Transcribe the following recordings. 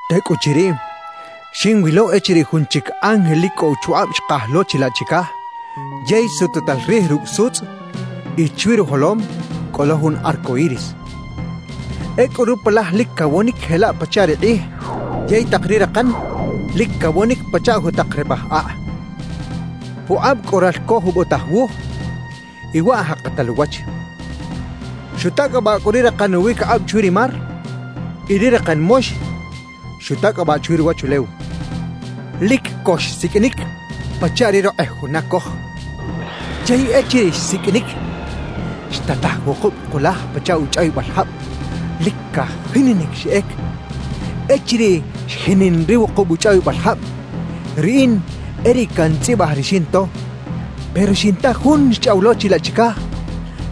Tecꞌuchiriꞌ, xinwilo echiriꞌ jun chic ángel lic cꞌo uchukꞌab xkaj lo chilaꞌ chicaj yey sututal rij rucꞌ sutzꞌ y chwi rujolom cꞌo lo jun arco iris. Ecꞌu rupalaj lic cawonic jelaꞌ pachaꞌ ri kꞌij yey tak ri rakan lic cawonic pachaꞌ jutak repaj akꞌ. Pukꞌab cꞌo ralco jubotaj wuj y waꞌ jakatal uwach. Xutacꞌabaꞌ cꞌu ri rakan uwiquikꞌab chwi ri mar y ri rakan mox xutacꞌabaꞌ chwi ruwachulew. Lic co xsiqꞌuinic pachaꞌ ri rokꞌej juna coj. Yey echiriꞌ xsiqꞌuinic, xtataj wukub kulaj pachaꞌ uchꞌawibal jab, lic cajininic xeꞌec. Echiriꞌ xjinin ri wukub uchꞌawibal jab, riꞌin e riꞌ cantzꞌibaj ri xinto; pero xinta Jun xchꞌaw lo chilaꞌ chicaj,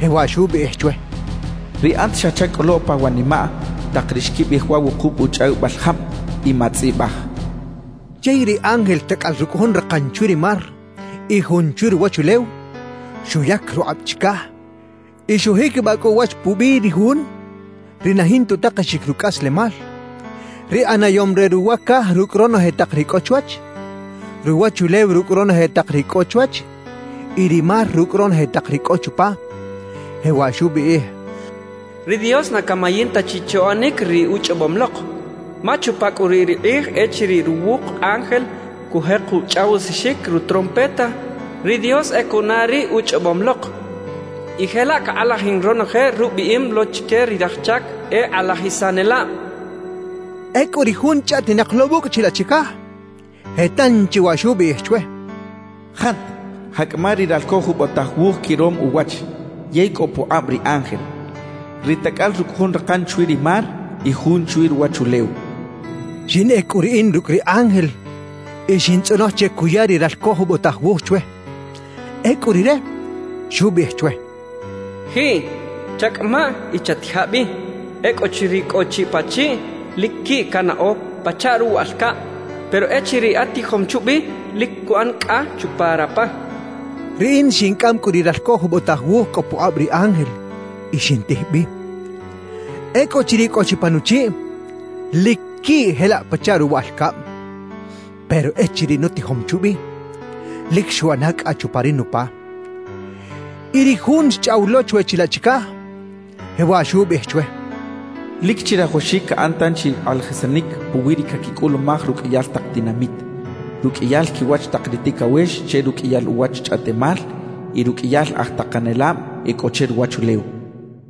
jewaꞌ xubiꞌij chwe: «Riꞌat xa chacꞌolo pawanimaꞌ tak ri xquibiꞌij wa wukub uchꞌawibal jab y matzꞌibaj» xchaꞌ. Yey ri ángel tacꞌal rucꞌ jun rakan chwi ri mar y jun chwi ruwachulew, xuyac rukꞌab chicaj y xujiquibaꞌ cꞌu uwach pubiꞌ ri Jun ri na jinta utakexic rucꞌaslemal, ri ꞌanayom re ruwa caj rucꞌ ronoje tak ri cꞌo chwach, ruwachulew rucꞌ ronoje tak ri cꞌo chwach y ri mar rucꞌ ronoje tak ri cꞌo chupa, jewaꞌ xubiꞌij: «Ri Dios na camayin ta chi che uꞌanic ri uchꞌobom lok. Ma chupa cꞌu riꞌ ri kꞌij echiriꞌ ruwuk ángel cujek uchꞌawisaxic rutrompeta, ri Dios e cuꞌana ri uchꞌobom lok y jelaꞌ cakꞌalajin ronoje rubiꞌim lo chique ri raj chac e kꞌalajisanelab» xchaꞌ. Ecꞌu ri Jun chꞌaꞌtinak lo wucꞌ chilaꞌ chicaj, je tanchi waꞌ xubiꞌij chwe: «Jat, jaꞌcꞌama ri ralco jubotaj wuj quirom uwach yey cꞌo pukꞌab ri ángel, ri tacꞌal rucꞌ jun rakan chwi ri mar y jun chwi ruwachulew» xchaꞌ. Xinꞌec cꞌu riꞌin rucꞌ ri ángel y xintzꞌonoj che cuya ri ralco jubotaj wuj chwe. Ecꞌu rire xubiꞌij chwe: «Jiꞌ, chacꞌamaꞌ y chatija bi. Ecꞌuchiriꞌ cꞌo chi pachiꞌ lic quiꞌ canaꞌo pachaꞌ ruwaꞌal cab, pero echiriꞌ atijom chubi lic cuꞌan cꞌa chupa rapa» xcha chwe. Riꞌin xincꞌam cꞌu ri ralco jubotaj wuj cꞌo pukꞌab ri ángel y xintij bi. Ecꞌuchiriꞌ cꞌo chi pa nuchiꞌ, lic quiꞌ jelaꞌ pachaꞌ ruwaꞌal cab; pero echiriꞌ nutijom chubi, lic xuꞌana cꞌa chupa ri nupa. Y ri Jun xchꞌaw lo chwe chilaꞌ chicaj, jewaꞌ xubiꞌij chwe: «Lic chirajawaxic caꞌan tanchi kꞌalajisanic puwi ri caquicꞌulumaj ruqꞌuiyal tak tinamit, ruqꞌuiyal quiwach tak ri ticawex che ruqꞌuiyal uwach chꞌaꞌtemal y ruqꞌuiyal aj takanelab e cꞌo che ruwachulew» xcha chwe.